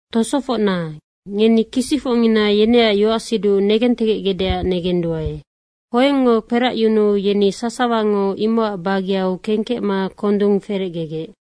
Tosofocna, ngeni kisicfocnina yeneac yoacsiduc negentegecgecdeac negenduae. Hoengngo kperacyunuu yeni sasawango imocac bageu kengkecma kondung ferecgegec.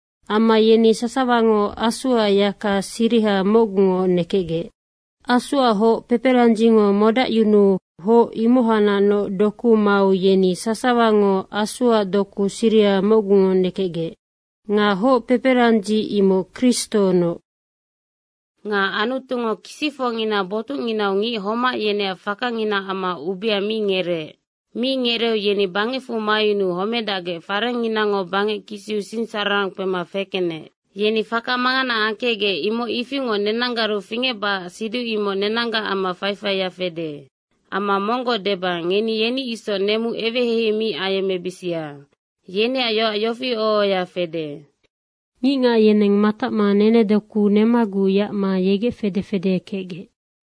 Amma yeni sasawango Asuac yaka siriha mocgu nekenggec. Asuac hoc peperandzingo modacyunuu hoc ihacnacnoc doku mau yeni sasawango Asuac doku siriha mocgu nekenggec. Nga hoc peperandzi imoc Kristonoc. Nga Anutungo kisicfocngina botucnginau ngic homac yeneac fakanginaac amma ubea mi ngereec. Mi ngereeu yeni bangecfu mayunuu homedacgec farengnginango bangec kisiu sinsararang kpema fekenec. Yeni faka mangana angkecgec, imoc ifingoc nenanggaru fingecbacac siduc imoc nenanggac amma faifaia fede. Amma monggoc deba, ngeni yeni isoc nemu eweheihei mi ayemmebisia. Yeneac yoac yofi oho ohoya fede, “Ngicngac yeneng matacma nenedoku nemaguc yacma yegec fede fede kecgec.”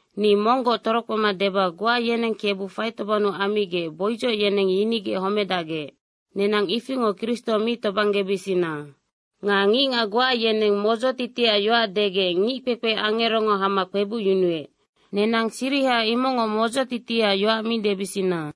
Ni monggoc torokpema deba, goa yeneng Kebu faitobang ammigec boidzoc yeneng yinigec homedacgec. Nenang ifingoc Kristo mi tobanggebisina. Nga ngicngac goa yeneng modzotitiac yoac degec ngickpekpe angerongo hama kpebucyunuec. Nenang siriha imocngoc modzotitiac yoac mi debisina.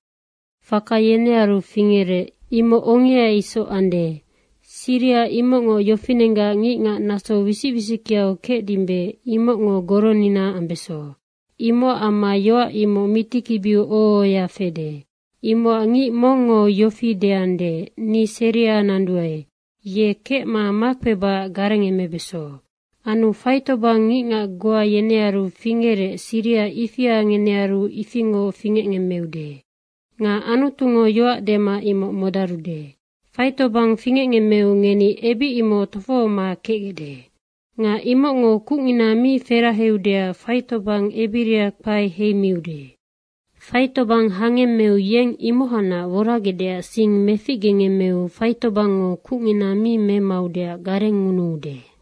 Faka yenearu fingerec, imoc ongea isoc ande. Siriha imocngoc yofinenggac ngicngac naso wisic wisickeau kecdimbe, imocngo goronina ambeso. Imocac amma yoac imoc mitikibiu oho ohoya fede. Imocac ngic mongngo yofi deande, “Ni seria nanduae.” ye kecma makpebacac garengemebeso. Anu faitobang ngicngac goa yenearu fingecgec, siriha ifia ngenearu ifingoc fingecngemmeude. Nga Anutungo yoac dema imoc modarude. Faitobang fingecngemmeu ngeni ebic imoc tofohoma kecgecde. Nga imocngo kucngina mi feraheudeac faitobang ebiria kpae heimiude. Faitobang hangemmeu yeng imohacnac woragecdeac sing meficgengemmeu faitobangngo kucngina mi memaudeac garengngunuude.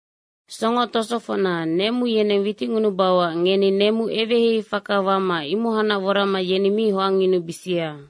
Songo tosofocna, nemu yeneng witicngunubauac ngeni nemu eweheihei faka wama imohacnac worama yeni mi hoangyunubisia.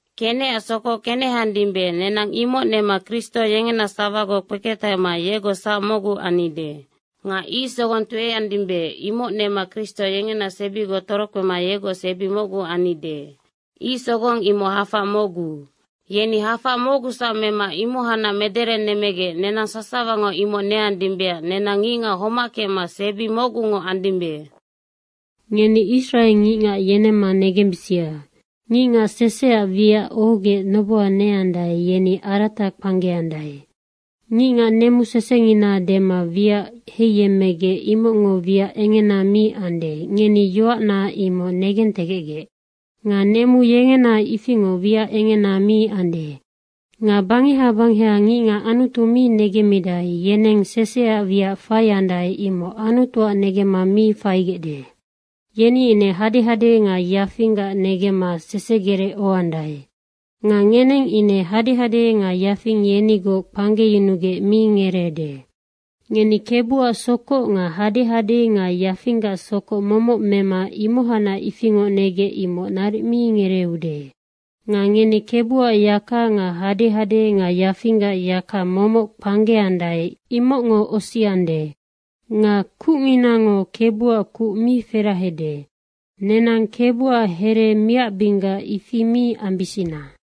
Kenecac sokoc keneheandimbe, nenang imoc nema Kristo yengena sawagoc kpeketahema yegoc sac mocgu annide. Nga ic sogong tueandimbe, imoc nema Kristo yengena sebigoc torokpema yegoc sebi mocgu annide. Ic sogong imoc hafac mocgu. Yeni hafac mocgusac mema imohacnac mederenemmegec nenang sasawango imoc neandimbeac nenang ngicngac homac kecma sebi mocgungoc andimbe. Ngeni Israe ngicngac yenemma negensibisia. Ngicngac seseac wiac ohogec noboha neandae, yeni arata kpanggeandae. Ngicngac nemu sesengina dema wiac heiyemmegec, imocngo wiac engena mi ande, ngeni yoacna imoc negentegecgec. Nga nemu yengena ifingoc wiac engena mi ande. Nga bangeha bangeha ngicngac Anutu mi negemmidae, yeneng seseac wiac faiandae, imoc Anutuac negemma mi faigecde. Yeni ine hadehade nga yafinggac negemma sesegerec ohoandae. Nga ngeneng ine hadehade nga yafing yenigoc kpanggeyunugec mi ngereede. Ngeni Kebuac sokoc nga hadehade nga yafinggac sokoc momoc mema imohacnac ifingoc negecde, imoc naric mi ngereeude. Nga ngeni Kebuac yaka nga hadehade nga yafinggac yaka momoc kpanggeandae, imocngo osiande. Nga kucninango Kebuac kuc mi ferahade. Nenang Kebuac here miacbinggac ifi mi ambisina.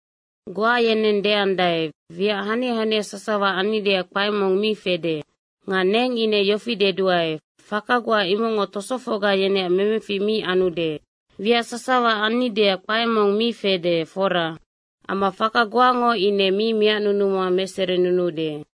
Goa yeneng deandae, “Wiac hania hania sasawa annideac kpae mong mi fede.” Nga neng ine yofi deduae, “Faka goa imocngo tosofocga yeneac memefic mi anude. Wiac sasawa annideac kpae mong mi fede, fora. Amma faka goango ine mi miacnunuma meserinunuude.”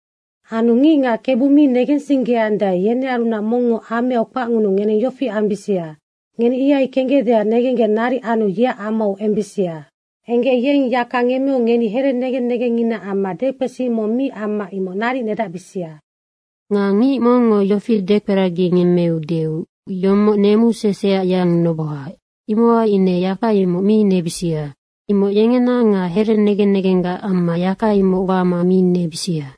Anu ngicngac Kebu mi negensinggeandae, yenearunac mongngo ameau kpacngunuu ngeneng yofi ambisia, ngeni ihai kenggecdeac negenggec naric anu yeac amau embisia. Enggec yeng yaka ngemmeu ngeni here negen negenginaac amma dekpesi mong mi amma imoc naric nedacbisia. Nga ngic mongngo yofi dekperagingemmeudeu, “Yomoc nemu seseac yang noboha.” imohai ine yaka imoc mi nebisia. Imoc yengena nga here negen negenggac amma yaka imoc wama mi nebisia.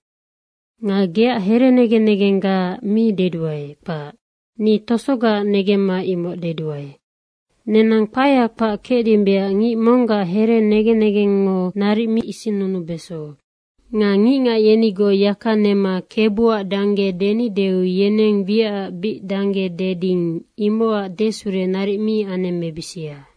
Nga geac here negen negenggaac mi deduae, kpac. Ni tosogaac negemma imoc deduae. Nenang kpaea kpac kecdimbeac ngic monggac here negen negengngo naric mi isinnunubeso. Nga ngicngac yenigoc yaka nema Kebuac dangge denideu yeneng wiacac bic dangge deding, imocac desure naric mi anemmebisia.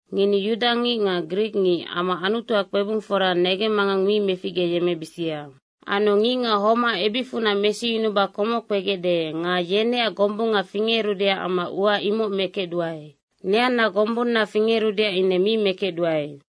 Ngeni yudangic nga grikngic amma Anutuac kpebungfora negemmangang mi meficgeyemmebisia. Anu ngicngac homac ebicfunac mesiyunuba komoc kpegecde nga yeneac gombunga fingerudeac amma ua imoc mekecduae. Neanna gombunna fingerudeac ine mi mekecduae.